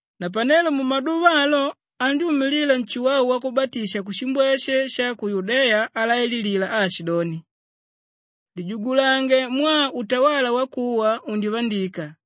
Napanelo mumaduva alo andyúmilila Nshuwau Wakubatisha kushimbweshe sha ku Yudeya alaililila aashidoni, “Lijugulange mwaa utawala wakuwa undivandika.”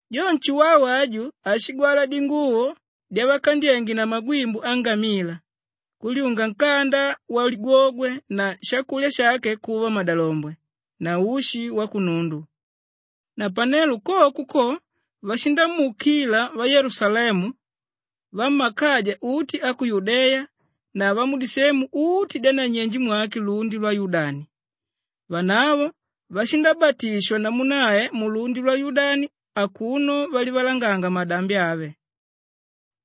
Jo Nshuwau aju ashigwala dinguvo dyavakandyénge na magwimbu angamila, kulyunga nkanda waligwogwe na shakulya shake kuva madalombwe na ushi wakunundu. Napanelo koko ko, vashindamuukila vayelusalemu, vammakaja uti a ku Yudeya na vamudisemu uti dyananyenje mwake lundi lwa Yudani. Vanavo vashindabatishigwa namu nae mulundi lwa Yudani akuno valivalanganga madambi ave.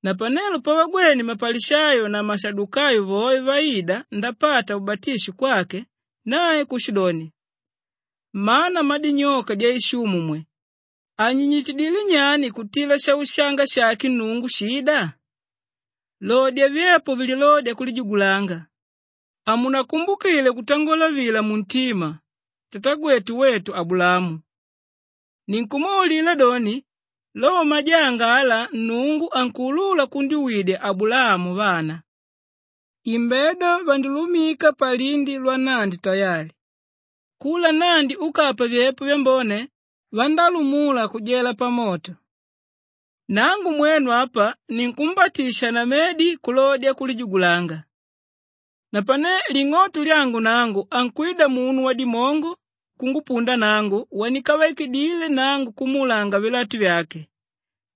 Napanelo pavagwene mapalishayo na mashadukayo voe vaida ndapata ubatisho kwake, nae kushidoni, “Mmana mmadinyoka dyaishumu mwe! Anyinyitidilé nyani kutila shaushanga shake Nnungu shída? Lodya vyepo vilódya kulijugulanga. Hamunakumbukile kutangola vila muntima, ‘Tatagwetu wetu Abulaamu.’ Ninkumwaulila doni, lo majanga ala Nnungu ankuulula kundyuwidya Abulaamu vana. Imbedo vandilumika palindi lwannandi tayali. Kula nnandi úkapa vyepo vyambone, vandálumula kujela pamoto. “Nangu mwenu apa, ninkumbatisha na medi kulodya kulijugulanga. Napane ling'oto lyangu nangu ankwida munu wadimongo kungupunda nangu wandikavaidile nangu kumuulanga vilatu vyake.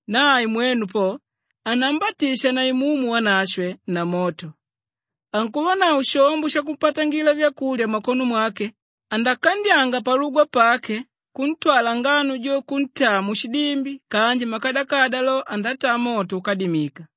Nae mwenu po, anambatisha na Imumu Wanashwe na moto. Ankuvanavo shombo shakupatangila vyakulya mmakono mwake; andakandyanga palugwa pake kuntwala ngano jo kuntaa mushidimbi kanji makadakada lo, andataa moto úkadimika.”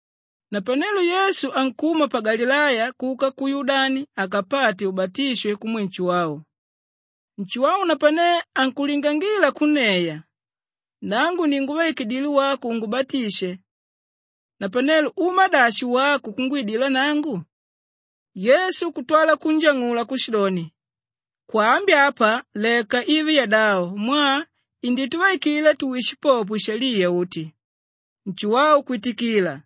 Napanelo Yesu ankuma pa Galileya kuka ku Yudani akapate ubatisho kumwe Nshuwau. Nshuwau napane ankulingangila kunneya, “Nangu ni ngúvaikidile wako ungubatishe. Napanelo uma dashi wako kungwidila nangu?” Yesu kutwala kunjang'ula kushidoni, “Kwaambi apa leka ive yadavo mwaa indituvaikila tuwishe popo ishaliya uti.” Nshuwau kwitikila.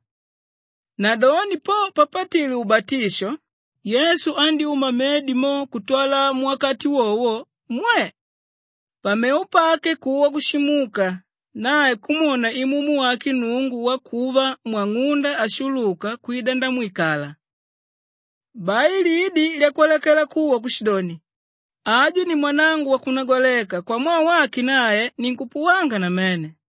Nadoni po papatile ubatisho, Yesu andyúma mmedi mo kutwala muwakati wowo, mwe! Pamevo pake kuwa kushimuka, nae kumwona Imumu wake Nnungu wakuva mwang'unda ashuluka kwida ndamwikala. Bai lidi lyakwalakela kuwa kushidoni, “Aju ni mwanangu wakunagwaleka, kwamwaa wake nae ninkupuwanga namene.”